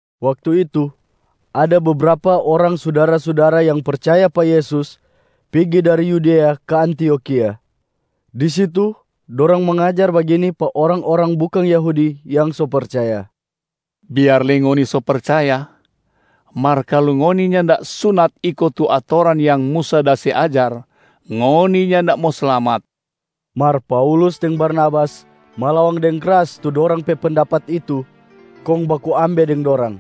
Waktu itu ada bebrapa orang sudara-sudara yang percaya pa Yesus pigi dari Yudea ka Antiokhia. Di situ dorang mangajar bagini pa orang-orang bukang Yahudi yang so percaya, “Biar lei ngoni so percaya, mar kalu ngoni nyanda sunat iko tu atoran yang Musa da se ajar, ngoni nyanda mo slamat.” Mar Paulus deng Barnabas malawang deng kras tu dorang pe pendapat itu kong baku ambe deng dorang.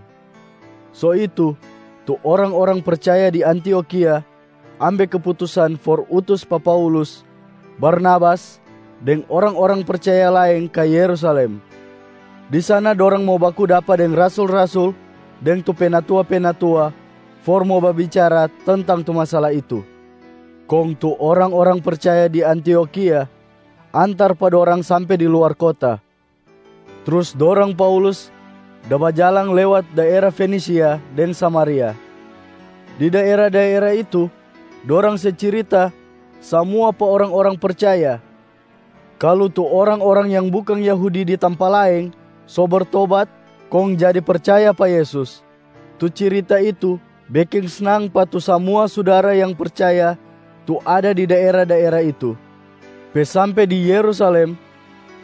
So itu tu orang-orang percaya di Antiokhia ambe keputusan for utus pa Paulus, Barnabas deng orang-orang percaya laeng ka Yerusalem. Di sana dorang mo baku dapa deng rasul-rasul deng tu penatua-penatua for mo babicara tentang tu masala itu. Kong tu orang-orang percaya di Antiokhia antar pa dorang sampe di luar kota. Trus dorang Paulus da bajalang lewat daera Fenisia deng Samaria. Di daera-daera itu, dorang se cirita samua pa orang-orang percaya kalu tu orang-orang yang bukang Yahudi di tampa laeng so bertobat kong jadi percaya pa Yesus. Tu cirita itu beking snang pa tu samua sudara yang percaya tu ada di daera-daera itu. Pe sampe di Yerusalem,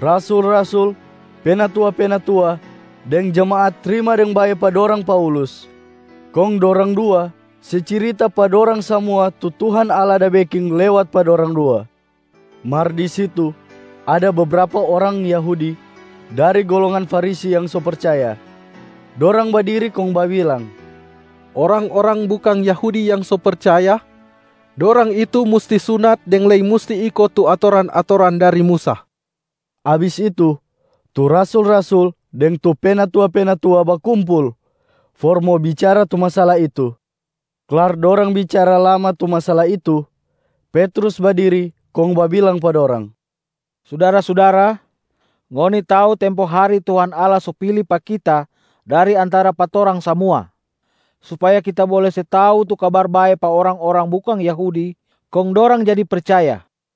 rasul-rasul, penatua-penatua, deng jemaat trima deng bae pa dorang Paulus. Kong dorang dua se cirita pa dorang samua tu Tuhan Allah da beking lewat pa dorang dua. Mar di situ ada bebrapa orang Yahudi dari golongan Farisi yang so percaya. Dorang badiri kong babilang, “Orang-orang bukang Yahudi yang so percaya, dorang itu musti sunat deng lei musti iko tu atoran-atoran dari Musa.” Abis itu, tu rasul-rasul deng tu penatua-penatua bakumpul for mo bicara tu masala itu. Klar dorang bicara lama tu masala itu, Petrus badiri kong babilang pa dorang, “Sudara-sudara, ngoni tau tempo hari Tuhan Allah so pili pa kita dari antara pa torang samua, supaya kita bole se tau tu Kabar Bae pa orang-orang bukang Yahudi kong dorang jadi percaya.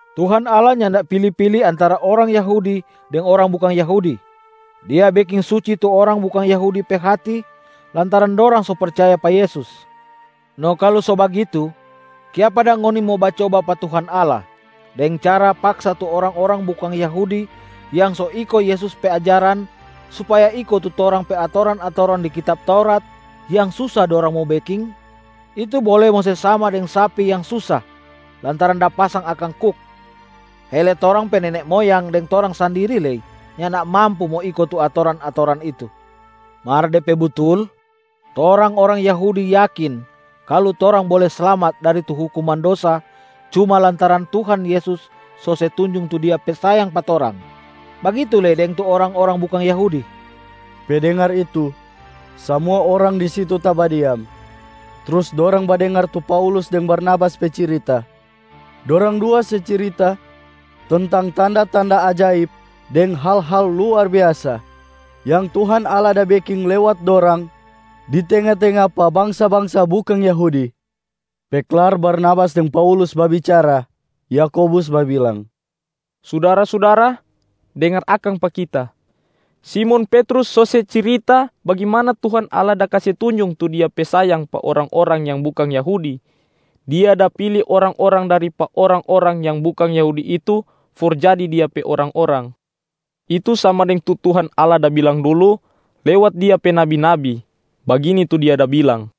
Tuhan Allah nyanda pili-pili antara orang Yahudi deng orang bukang Yahudi. Dia beking suci tu orang bukang Yahudi pe hati lantaran dorang so percaya pa Yesus. No kalu so bagitu kiapa dang ngoni mo bacoba pa Tuhan Allah, deng cara paksa tu orang-orang bukang Yahudi yang so iko Yesus pe ajaran supaya iko tu torang pe atoran-atoran di kitab Taurat yang susa dorang mo beking? Itu bole mo se sama deng sapi yang susa lantaran da pasang akang kuk. Hele torang pe nene moyang deng torang sandiri lei nyanda mampu mo iko tu atoran-atoran itu. Mar de pe butul, torang orang Yahudi yakin kalu torang bole slamat dari tu hukuman dosa cuma lantaran Tuhan Yesus so se tunjung tu Dia pe sayang pa torang, bagitu lei deng tu orang-orang bukang Yahudi.” Pe dengar itu, samua orang di situ tabadiam. Trus dorang badengar tu Paulus deng Barnabas pe cirita. Dorang dua se cirita tentang tanda-tanda ajaib deng hal-hal luar biasa yang Tuhan Allah da beking lewat dorang di tenga-tenga pa bangsa-bangsa bukang Yahudi. Pe klar Barnabas deng Paulus babicara, Yakobus babilang, “Sudara-sudara, dengar akang pa kita! Simon Petrus so se cirita bagimana Tuhan Allah da kase tunjung tu Dia pe sayang pa orang-orang yang bukang Yahudi. Dia da pili orang-orang dari pa orang-orang yang bukang Yahudi itu for jadi Dia pe orang-orang. Itu sama deng tu Tuhan Allah da bilang dulu lewat Dia pe nabi-nabi. Bagini tu Dia da bilang,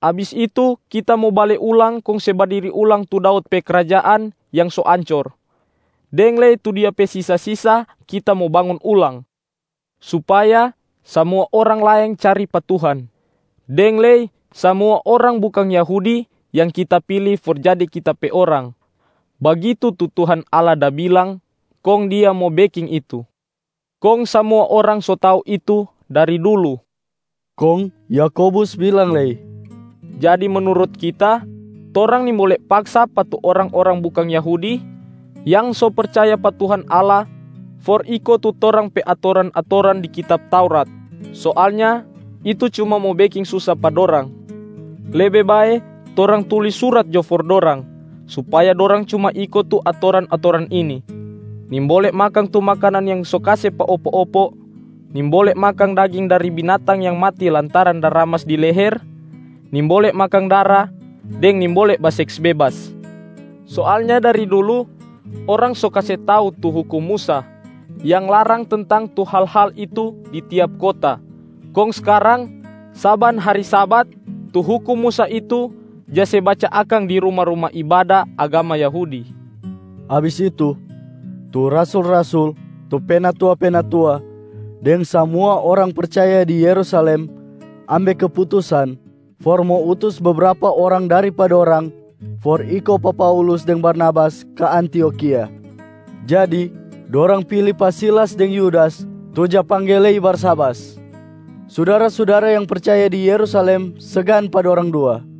‘Abis itu Kita mo bale ulang kong se badiri ulang tu Daud pe krajaan yang so ancor, deng lei tu dia pe sisa-sisa Kita mo bangun ulang, supaya samua orang laeng cari pa Tuhan, deng lei samua orang bukang Yahudi yang Kita pili for jadi Kita pe orang. Bagitu tu Tuhan Allah da bilang kong Dia mo beking itu, kong samua orang so tau itu dari dulu.’” Kong Yakobus bilang lei, “Jadi menurut kita, torang nimbole paksa pa tu orang-orang bukang Yahudi yang so percaya pa Tuhan Allah for iko tu torang pe atoran-atoran di kitab Taurat. Soalnya itu cuma mo beking susa pa dorang. Lebe bae torang tulis surat jo for dorang, supaya dorang cuma iko tu atoran-atoran ini: nimbole makang tu makanan yang so kase pa opo-opo, nimbole makang daging dari binatang yang mati lantaran da ramas di leher, nimbole makang dara, deng nimbole baseks bebas. Soalnya dari dulu orang so kase tau tu hukum Musa yang larang tentang tu hal-hal itu di tiap kota. Kong skarang, saban hari Sabat tu hukum Musa itu ja se baca akang di ruma-ruma Ibada agama Yahudi.” Abis itu, tu rasul-rasul, tu penatua-penatua deng samua orang percaya di Yerusalem ambe keputusan for mo utus bebrapa orang dari pa dorang for iko pa Paulus deng Barnabas ka Antiokhia. Jadi, dorang pili pa Silas deng Yudas tu ja pangge lei Barsabas. Sudara-sudara yang percaya di Yerusalem segan pa dorang dua.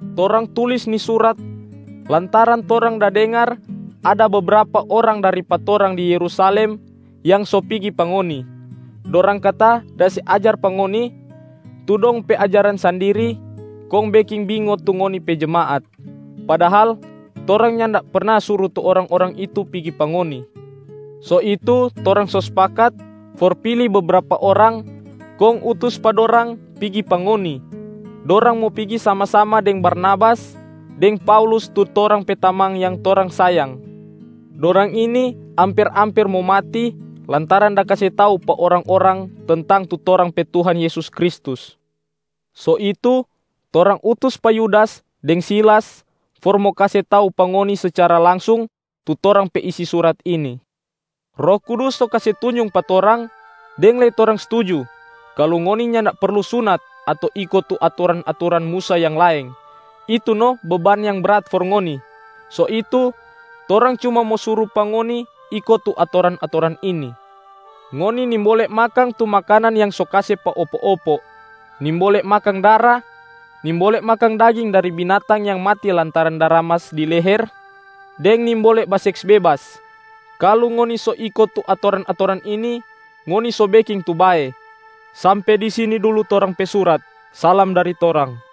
Torang tulis ni surat lantaran torang da dengar ada bebrapa orang dari pa torang di Yerusalem yang so pigi pa ngoni. Dorang kata da se ajar pa ngoni tu dong pe ajaran sandiri kong beking bingo tu ngoni pe jemaat. Padahal torang nyanda perna suru tu orang-orang itu pigi pa ngoni. So itu torang so spakat for pili bebrapa orang kong utus pa dorang pigi pa ngoni. Dorang mo pigi sama-sama deng Barnabas deng Paulus tu torang pe tamang yang torang sayang. Dorang ini amper-amper mo mati lantaran da kase tau pa orang-orang tentang tu torang pe Tuhan Yesus Kristus. So itu, torang utus pa Yudas deng Silas for mo kase tau pa ngoni secara langsung tu torang pe isi surat ini. Roh Kudus so kase tunjung pa torang, deng lei torang stuju, kalu ngoni nyanda perlu sunat ato iko tu atoran-atoran Musa yang laeng, itu no beban yang brat for ngoni. So itu, torang cuma mo suru pa ngoni iko tu atoran-atoran ini: ngoni nimbole makang tu makanan yang so kase pa opo-opo, nimbole makang dara, nimbole makang daging dari binatang yang mati lantaran da ramas di leher, deng nimbole baseks bebas. Kalu ngoni so iko tu atoran-atoran ini, ngoni so beking tu bae. Sampe di sini dulu torang pe surat, salam dari torang.”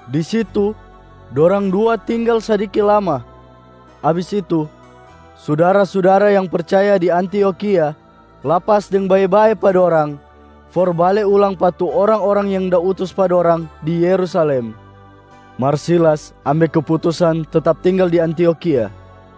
Di situ dorang dua tinggal sadiki lama. Abis itu, sudara-sudara yang percaya di Antiokhia lapas deng bae-bae pa dorang for bale ulang pa tu orang-orang yang da utus pa dorang di Yerusalem. [ Mar Silas ambe keputusan tetap tinggal di Antiokhia.]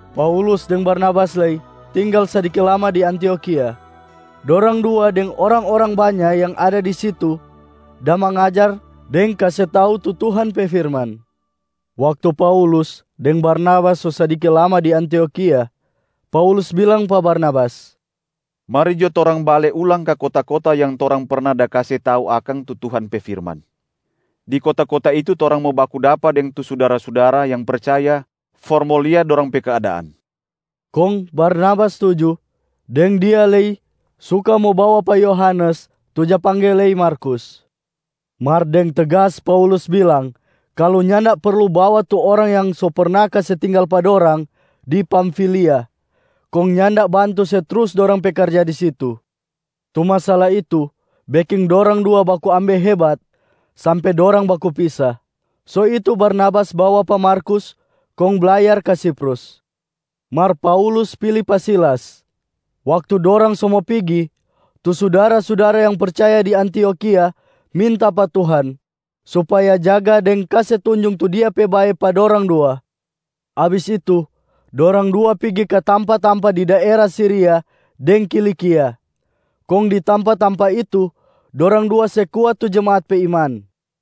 Paulus deng Barnabas lei tinggal sadiki lama di Antiokhia. Dorang dua deng orang-orang banya yang ada di situ da mangajar deng kase tau tu Tuhan pe firman. Waktu Paulus deng Barnabas so sadiki lama di Antiokhia, Paulus bilang pa Barnabas, “Mari jo torang bale ulang ka kota-kota yang torang perna da kase tau akang tu Tuhan pe firman. Di kota-kota itu torang mo baku dapa deng tu sudara-sudara yang percaya for mo lia dorang pe keadaan.” Kong Barnabas stuju deng dia lei suka mo bawa pa Yohanes tu ja pangge lei Markus. Mar deng tegas Paulus bilang kalu nyanda perlu bawa tu orang yang so perna kase tinggal pa dorang di Pamfilia kong nyanda bantu se trus dorang pe karja di situ. Tu masala itu beking dorang dua baku ambe hebat sampe dorang baku pisa. So itu Barnabas bawa pa Markus kong blayar ka Siprus. Mar Paulus pili pa Silas. Waktu dorang so mo pigi, tu sudara-sudara yang percaya di Antiokhia minta pa Tuhan supaya jaga deng kase tunjung tu Dia pe bae pa dorang dua. Abis itu, dorang dua pigi ka tampa-tampa di daera Siria deng Kilikia, kong di tampa-tampa itu dorang dua se kuat tu jemaat pe iman.